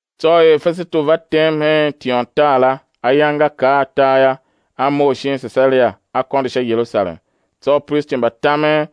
Tsô er Fesetu va tem hen tiôntar la, ayange nga kar atar yô, a mough shin Sesaria, a kôndo sha Yerusalem. Tsô upristi mba tamen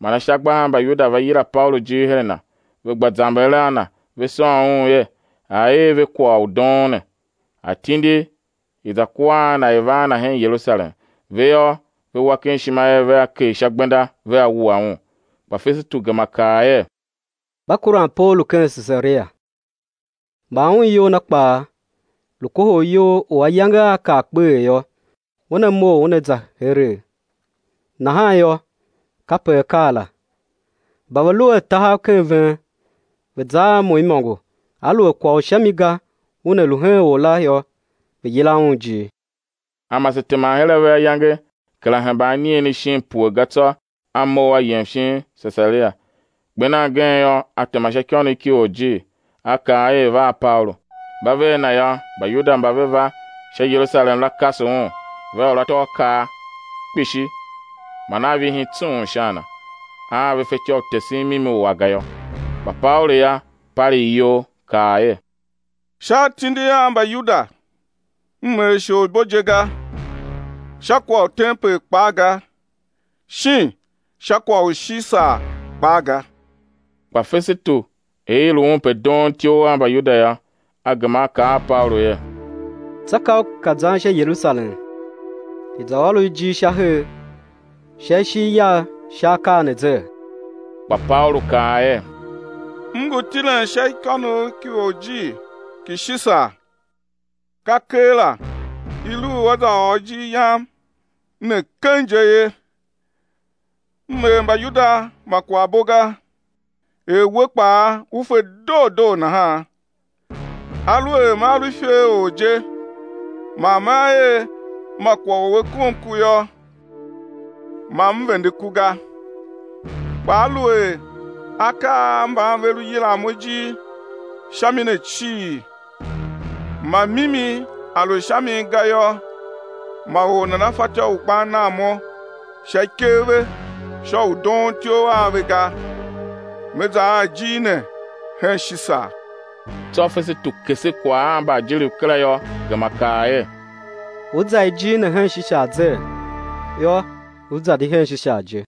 man ashagba a Mbayuda va yila Paulu ijir her a na, ve gba zamber a na ve sôn un er, a̱ er ve kwagh u doon ne, a̱ tindi i̱ za kua a na i̱ va a na hen Yerusalem; ve yô, ve wa ken ishima er vea kegh sha gbenda vea wua un. Kpa Fesetu gema kaa er: Mba kuran Paulu ken Sesaria, man un iyol na kpaa lu kohol iyol u ayange aa kar kpeghee yô, una mough una za heregh. Nahan yô, kape a kaa la, mba ve lu a tahav ken ven, ve̱ za a mo imôngo aluer kwagh u sha mi ga una lu hen or la yô, ve̱ yila un ijir. A mase teman her a ve ayange kera hemba anigheni shin pue ga tsô a mough a yem shin Sesaria; kper nan gen yô, a tema sha ikônough ki orjir, a kaa er i̱ va a Paulu. Mba ve a na yô, Mbayuda mba ve va sha Yerusalem la, kase un, ve ôr atôakaa kpishi man a vihin tsung sha a na, a ve fatyô u tesen mimi u a ga yô. Kpa Paulu yô, palegh iyol, kaa er: Sha atindi a Mbayuda m er isholibo je ga, sha kwagh u tempel kpaa ga, shin sha kwagh u Shisar kpaa ga. Kpa Fesetu, er i lu un pe doon ityough a Mbayuda yô, a gema a kaa a Paulu er: Tsô ka u ka zan sha Yerusalem, i̱ za ôr u ijir sha her, sha ishigh yagh sha akaa ne zee? Kpa Paulu kaa er: M ngu tilen sha ikônough ki orjir ki Shisar, ka keela i lu u á za ôr ijir yam ne keng je ye. M er Mbayuda ma kwaghbo ga, er we kpaa u fe doo doo nahan. Aluer mea lu iferor je, man mea er ma kwagh u a kom ku yô, ma m vende ku ga. Kpa aluer akaa a mban ve lu yilan mo ijir sha mi ne cii, ma mimi a lu sha min ga yô, ma or nana fatyô u gban nan mo sha ikev ve sha u doon ityough a ve ga. Me za a ijir ne hen Shisar. Tsô Fesetu kese kwagh a mbaajiriv kera yô, gema kaa er: Ú za ijir ne hen Shisar zee? Yô, ú za di hen Shisar je.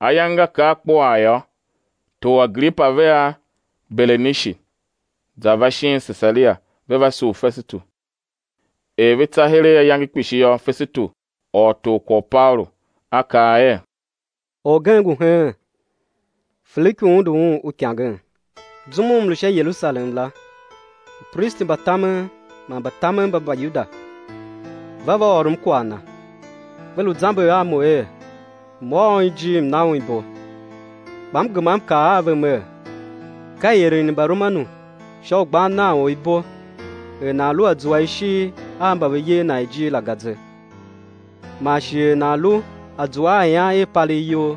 Ayange nga kar kpuaa yô, tor Agripa vea Berenishi za va shin Sesaria, ve va sugh Fesetu. Er ve tsa heregh ayange kpishi yô, Fesetu ôr tor kwagh u Paulu, a kaa er: Orgen ngu heen, Feliku undu un uikangen; zum u m lu sha Yerusalem la, upristi mba tamen man mbatamen mba Mbayuda va va ôrom kwagh na, ve lu zamber a mo er, m̱ ôr un ijir m̱ na un ibo. Kpa m gema m kaa a ve mer: Ka ieren i Mbaromanu sha u gban nan or ibo, er nan lu a zua ishigh a mba ve yer nan ijir la ga ze, man shi er nan lu a zua a ian i palegh iyol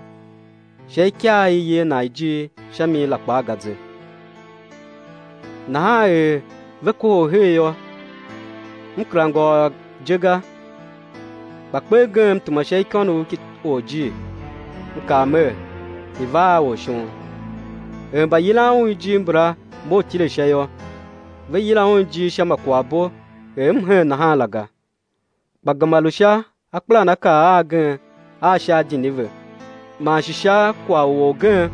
sha ikaa i i yer nan ijir sha mi la kpaa ga ze. Nahan er ve kohol her yô, m kera ngôôr je ga; kpa kper gen m tema sha ikônough ki orjir, m kaa mer, i̱ va a or shon. Er mbayilan un ijir mbala mough tile sha yô, ve yila un ijir sha ma kwaghbo er m hen nahan la ga, kpa gema lu sha akpelanakaa agen a sha adini ve, man shi sha kwagh u orgen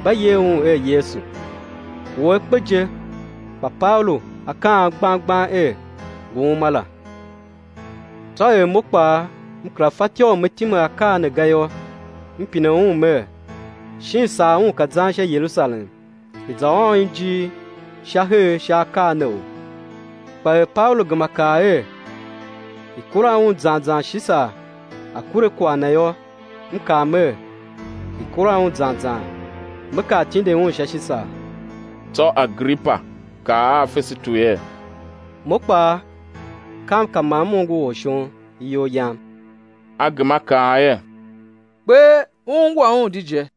mba yer Un er Yesu, u A kpe je, kpa Paulu a kaan gbang gbang er, ngu uma la. Tsô er mo kpaa m kera fatyô u me time akaa ne ga yô, m pine un mer, shin sar un ka zan sha Yerusalem i̱ za ôr un ijir sha her sha akaa neou? Kpa er Paulu gema kaa er i̱ kura un zan zan Shisar a̱ kure kwagh na yô, m kaa mer, i̱ kura un zan zan me kar tindin un hen Shisar. Tsô Agripa kaa a Fesetu er: Mo kpaa kam ka ma m ongo or shon iyol yam. A gema a kaa er: Kper ú ungwa un di je.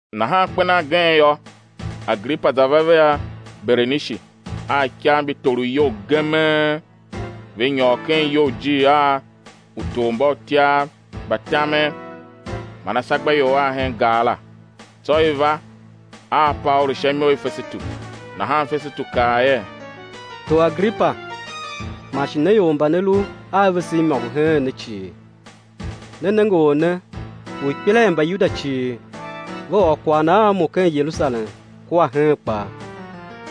Nahan kper nan gen yô, Agripa za va vea Berenishi a ikav mbi torov iyol gemee, ve nyôr ken iyoujir a utormbautyav mba tamen man ashagbaior a hen gar la; tsô i va a Paulu sha imo i Fesetu. Nahan Fesetu kaa er: Tor Agripa, man shi ne ior mba ne lu a vese imôngo heen ne cii, ne nenge or ne u ikpela i Mbayuda cii, ve ôr kwagh na a mo ken Yerusalem kua heen kpaa,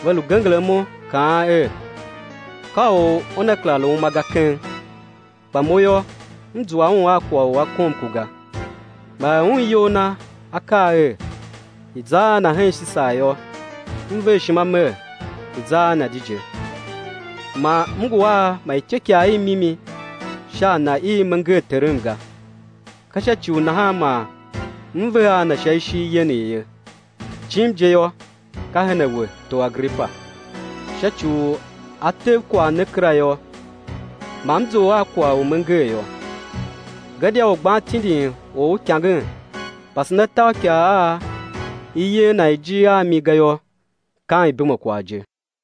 ve lu genger imo, kaan er, ka u una kera lu uma ga keng. Kpa mo yô, m zua un a kwagh u a kom ku ga, man er un iyol na a kaa er, i̱ za a na hen Shisar yô, m ver ishima mer, i̱ za a na di je. Man m ngu a ma ityôkwagh i mimi sha a na i me nger terem ga; ka sha ci u nahan man m ve a na sha ishigh yenegh ye; jim je yô, ka her a we, tor Agripa, sha ci u a tev kwagh ne kera yô, ma m zough a kwagh u me nger yô. Gadia u gban tindin or uikangen, pasen atôakaa a i yer nan ijir a mi ga yô, kam ibumekwagh je.